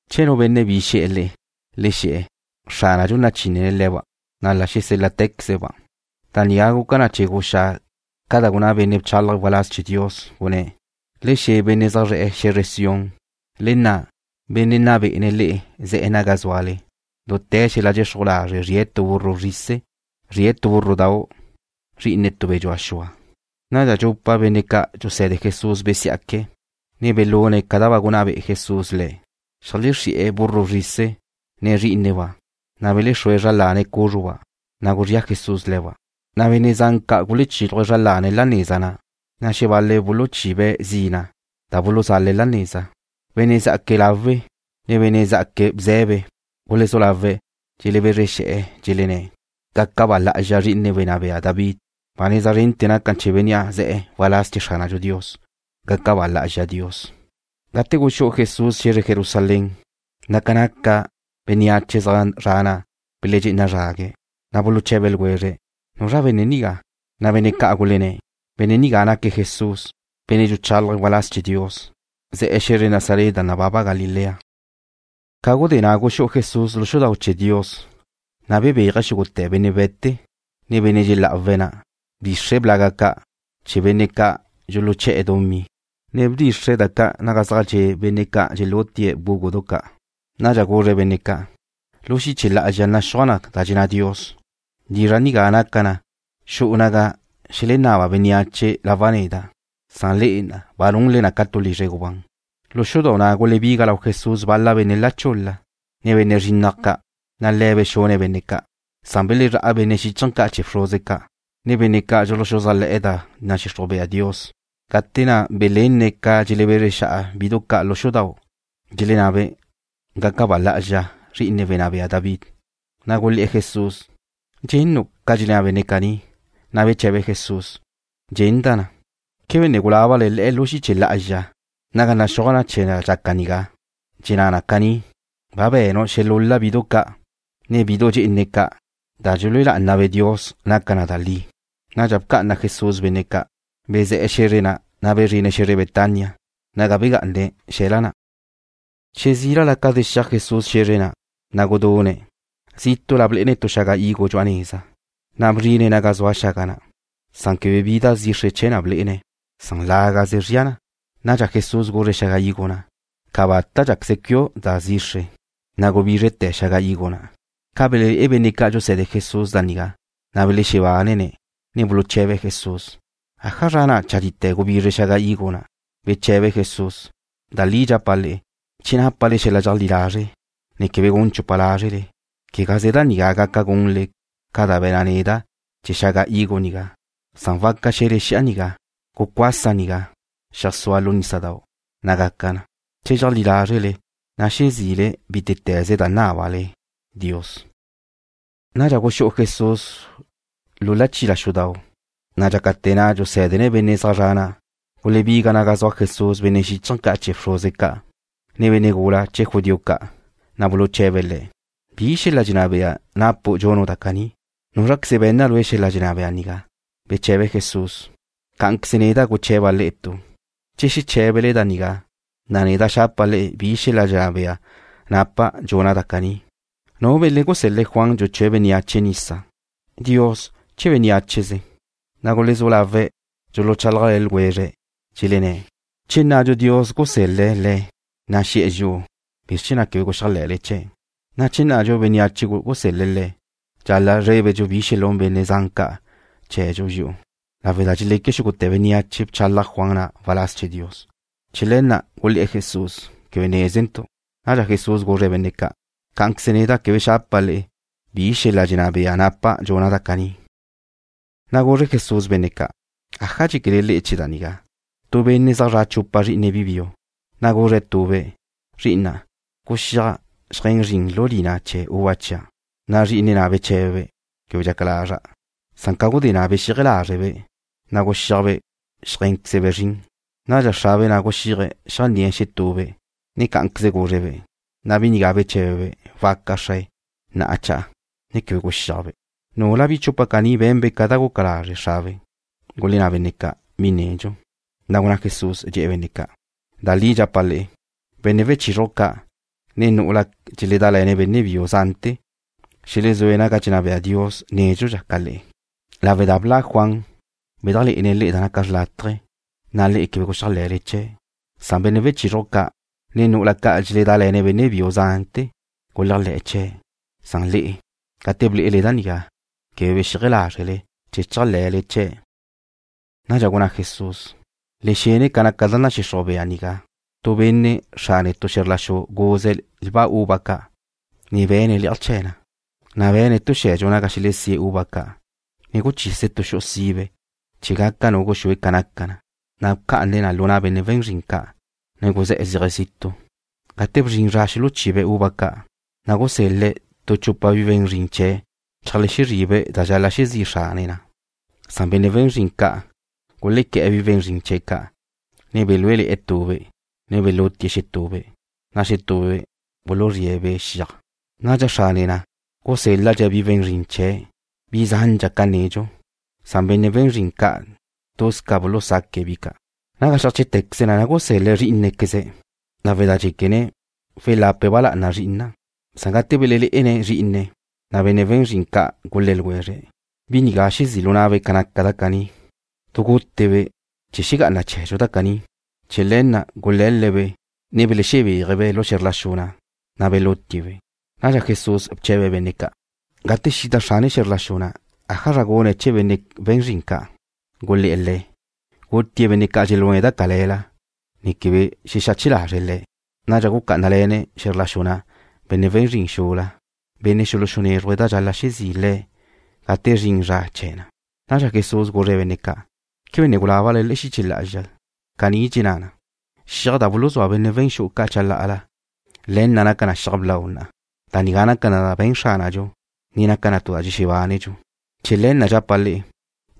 Che nu benne' bi xe̱'e̱ le'e, le xe̱'e̱: “Xránadxu nachinne̱' le̱ba', na' la xesél-la'te̱queze̱'-ba'.” Da nigá guca na chee̱ guxá ca da gunná benne' bchálaje̱' waláz chee̱ Dios, gunné̱': Le xe̱ benne' zaj zra' xe̱zre Sión: “Le nna', Benne' nna bé'ene̱' le'e ze̱'e̱ naga zúale. Dute̱ xel-la' dxexruj lazre' zrie̱' tu burro bzrise'. Zrie̱' tu búrrodau', zri'ine tu be̱ dxua xua.” Nadxa dxupa benne' ca' dxuse̱de Jesús besiá'que̱', ne belune̱' ca da ba gunná be'e Jesús le̱'. Xeajlexrí'e̱ burro bzrise', ne zrí'ineba', na' belezrúe̱' zra lane̱' cúzruba', na' guzría Jesús le̱ba'. Benne' zan ca' gulechílaje̱' zra lane̱' la neza na', na' xebal-le̱' buluchibe̱' zina' da buluzale̱' la neza. Benne' zjaque̱' láwela, ne benne' zá'aque̱' bze̱be gulezú lawe̱' dxelebezre xe̱'e̱, dxelenné̱': ―¡Gaca ba lá'azxa Zri'ine wenná bea David! ¡Ba neza zrente̱ naca na chee̱ bénnea' ze̱'e̱ waláz chee̱ Xránadxu Dios! ¡Gaca ba lá'azxa Dios! Gate guxú'u Jesús xe̱zre Jerusalén, ca naca bénneache zaj zre̱'e̱ na' beledxé'ena zrague̱', na' buluche̱be ljwezre̱': ―¿Nuzra benne' nigá? Bal-la benne' ca' gulenné̱': ―Benne' nigá naque̱' Jesús, benne' dxuchálaje̱' waláz chee̱ Dios, ze̱'e̱ xe̱zre Nazaret da nababa Galilea. Ca gudé na' guxú'u Jesús dxale'aj xudau' chee̱ Dios, na' bebéaje̱' xúgute̱ benne' we̱te, ne benne' dxelá'awe̱' na'. Bdxixre̱' blag ca' chee̱ benne' ca' dxuluché̱'e̱ dumí, ne bdxixre̱' da ca' zaj dxe' benne' ca' dxelútie̱' bgúgudu ca'. Nadxa guzre̱' benne' ca': ―Lu xiche lá'azxa naxúaj da dxenná Dios: “Lizra' nigá naca na xu'u naga xelenaba bénneache lawa' neda'”, san le'e ba nunle na ca tu lizre gubán. Lu dxale'aj xudau' na' gulebiga lau Jesús bal-la benne' la chul-la, ne benne' zrinnaj ca', na' Le̱' bexune̱' benne' ca'. Belezrá' benne' xíchaje̱ ca' chee̱ bxruze ca', ne benne' ca' dxuluxuzájle̱'e̱ da nadxixruj bea Dios, gate na' belenne̱' ca dxelebezre xa'a bidu ca' lu xudau', dxelennabe': “¡Gaca ba lá'azxa zri'ine wenná bea David!” Gulé̱'e̱ Jesús: ―¿Dxennu' ca dxelenná benne' caní? Beche̱be Jesús: ―Dxenda' na. ¿Quebe ne gulábale le'e lu xiche lá'azxa naga naxúaj na chee̱ da dxaca nigá? Dxenná na caní: Ba be̱nu' xelúl-la bidu ca', ne bidu dxe'ene ca'. Da dxelúe lá'anabe' Dios naca na da li. Nadxa bca'ana Jesús benne' ca'. Bezé̱'e̱ xe̱zre na', na' bezrine̱' xe̱zre Betania, naga bejgá'ane̱' xe̱la na'. Che zílala ca zexíaj Jesús xe̱zre na', na' gudune̱'. Zítu'la blé'ene̱' tu xaga higo dxu'a neza, na' gate bzrine̱' naga zua na, quebe bi da zixre chee̱ na blé'ene̱'. Lágaze zria na. Nadxa Jesús guzre̱' xaga higo na': ―Cabata' cuíaquezu' da zixre. Gubízrete̱ xaga higo na'. Ca belelé'e benne' ca' dxuse̱de Jesús da nigá, na' belexebánene̱', ne buluche̱be̱' Jesús: ―¿Ájazra na' chadite̱ gubizre xaga higo nigá? Beche̱be Jesús: ―Da li dxapa' le'e, che nápale xel-la' dxeajlí lazre', ne quebe gun chupa lázrele, quegaze da nigá gaca gunle ca da be̱na' neda' chee̱ xaga higo nigá, san waca xe̱le xi'a nigá: Gucuasa nigá, xeajsúa lu nísadau', na' gaca na. Che dxeajlí lázrele, na' xezi'le bítete̱ze da nábale Dios. Nadxa guxú'u Jesús lu chila xudau', na' dxácate̱ na' dxusé̱dene̱' benne' zaj zre̱'e̱ na', gulebiga naga zua Jesús benne' xíchaje̱ ca' chee̱ bxruze ca', ne benne' gula chee̱ judío ca', na' buluche̱be̱' Le̱': ―¿Bi xel-la' dxenná bea napu' dxunu' da caní? ¿Núzraqueze be̱nna lue' xel-la' dxenná bea nigá? Beche̱be Jesús: ―Cá'anqueze neda' guche̱ba' le'e tu. Che xeché̱bele da nigá, na' neda' xapa' le'e bi xel-la' dxenná bea napa' dxuna' da caní. ¿Nu benne' gusel-le̱' Juan dxuchúe̱' bénneache nisa? ¿Dios, che bénneacheze? Gulezú lawe̱' dxuluchálajle̱ ljwezre̱', dxelenné̱': ―Che nnadxu Dios gusel-le̱' le̱', na' xe̱'e̱ dxi'u: “¿Bizr chee̱ na' quebe guxéajle̱le chee̱'?” Che nnadxu bénneache gusel-le̱' le̱', dxal-la' zrébedxu bi xelún benne' zan ca' chee̱dxu dxi'u, lawe' da dxeleque xúgute̱ bénneache bchalaj Juan na' waláz chee̱ Dios. Chee̱ le̱ na' gulé̱'e̱ Jesús: ―Quebe nézentu'. Nadxa Jesús guzre̱' benne' ca': ―Cá'anqueze neda' quebe xapa' le'e bi xel-la' dxenná bea napa' dxuna' da caní. Na' guzre Jesús benne' ca': ―¿Aja dxéquele le'e chee̱ da nigá? Tu benne' zaj zra' chupa zrí'ine̱' bi biu, na' guzre̱' tube': “Zri'ina', guxíaj xeajé̱n zrin lu lina chee̱ uva chia'.” Zrí'ine̱' na' beché̱bebe': “Quebe dxaca lazra'.” Ca gudé na' bexíaje lázrebe', na' guxíajbe' xeajé̱nquezbe' zrin. Cá'anqueze xrabe' na' guxíaje̱' xeajné̱'e̱ xetube', ne guzre̱'-be', na' bi nigá beché̱bebe': “Waca, xrae. Na'a cha'a.” Quebe guxíajbe'. ¿Núlabe' bi chupa caní be̱nbe' ca da guca lazre' xrabe'? Gulenná benne' ca': ―Bi nedxu. Na' gunná Jesús, dxe̱'e̱ benne' ca': ―Da li dxapa' le'e, benne' wechizruj ca', ne nu'ula dxeledále̱ benne' biu zante̱ xelexú'e̱ naga dxenná bea Dios nédxudxa ca le'e lawe' da bla' Juan, bedajlé'ene̱' le'e da naca xrlátaje, na' le'e quebe guxéajle̱le chee̱'. Benne' wechizruj ca', ne nu'ula ca' dxeledále̱ benne' biu zante̱ guléajle̱'e̱ chee̱'. Le'e, gate ble'ele da nigá, quebe bexíaje lázrele chee̱ chéajle̱le chee̱'. Nadxa gunná Jesús: ―Le xene ca naca da nadxixruj bea nigá. Tu benne' xrane tu xe̱zr la xu guze̱' lba uva ca', ne be̱ne̱' le'aj chee̱ na. Be̱ne̱' tu xe̱dxu naga xelesíe̱' uva ca', ne guchise̱' tu xu'u sibe chee̱ gaca nu guxúe ca naca na. Na' bca'ane̱' na lu na' benne' we̱n zrin ca', ne guzé̱'e̱ zéaje̱' zitu'. Gate bzrin zra xuluchibe̱' uva ca', na' gusel-le̱' tu chupa bi we̱n zrin chee̱' zeajlexezri'be' da dxal-la' xezí' xrane na'. Benne' we̱n zrin ca' gulequé̱'e̱ bi we̱n zrin chee̱' ca'. Belúele̱'e̱ tube', ne belutie̱' xetube', na' xetube' buluzríe̱'-be' xiaj. Nadxa xrane na' gusél-ladxe̱' bi we̱n zrin chee̱' bi zandxa ca nedxu. Benne' we̱n zrin ca' tuz ca bulusaque̱' bi ca'. Naga xeajché'tequeze na gusel-le̱' zrí'inequeze̱' lawe' da dxéquene̱': Welape̱' ba lá'ana zri'ina'. Gate belelé'ene̱' zrí'ine̱', na' benne' we̱n zrin ca' gulé̱ ljwezre̱': “Bi nigá xezí' lu na'be' ca naca da caní. Du gute-be' chee̱ xegá'ana chee̱dxu da caní.” Chee̱ le̱ na' gule̱le̱'-be', ne belexebéaje̱'-be' lu xe̱zr la xu na', na' belutie̱'-be'. Nadxa Jesús bche̱be̱' benne' ca': ―Gate xida xrane xe̱zr la xu na', ¿ájazra gune̱' chee̱ benne' we̱n zrin ca'? Gulé̱'e̱ Le̱': ―Gutie̱' benne' ca' dxelune̱' da cale̱la ne quebe xexache lazre̱' le̱'. Nadxa gucá'anale̱ne̱' xe̱zr la xu na' benne' we̱n zrin xula, benne' xuluxunézruje̱' da dxal-la' xezí' le̱' gate zrin zra chee̱ na. Nadxa Jesús guzre̱' benne' ca': ―¿Quebe ne gulábale le'e xiche lá'azxa? Caní dxenná na: Xiaj na' da buluzúa benne' we̱n xu'u ca' chalá'ala, le̱ na' naca na xiaj blau na'a. Da nigá naca na da be̱n Xránadxu, ne naca na tu da dxexebánedxu. Chee̱ le̱ na' dxapa' le'e,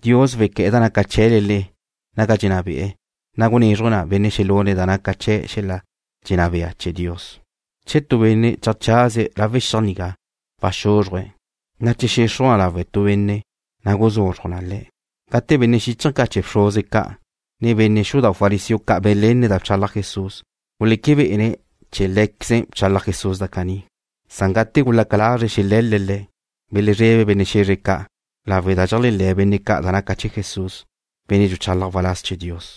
Dios wequé̱'e̱ da naca chee̱le le'e naga dxenná be'e̱, na' gunézruje̱' na benne' xelune̱' da naca chee̱ xel-la' dxenná bea chee̱ Dios. Che tu benne' cheajchazie̱' lawe' xiaj nigá waxúzruje̱', na' che xexruj na lawe' tu benne', na' guzuzruj na le̱'. Gate benne' xíchaje̱ ca' chee̱ bxruze ca', ne benne' xudau' fariseo ca' belenne̱' da bchalaj Jesús, guleque bé'ene̱' chee̱ lé̱queze̱' bchalaj Jesús da caní. Gate gulaca lazre̱' xele̱le̱' Le̱', belezrebe̱' benne' xe̱zre ca' lawe' da dxeléajle̱ benne' ca' naca Jesús benne' dxuchálaje̱' waláz chee̱ Dios.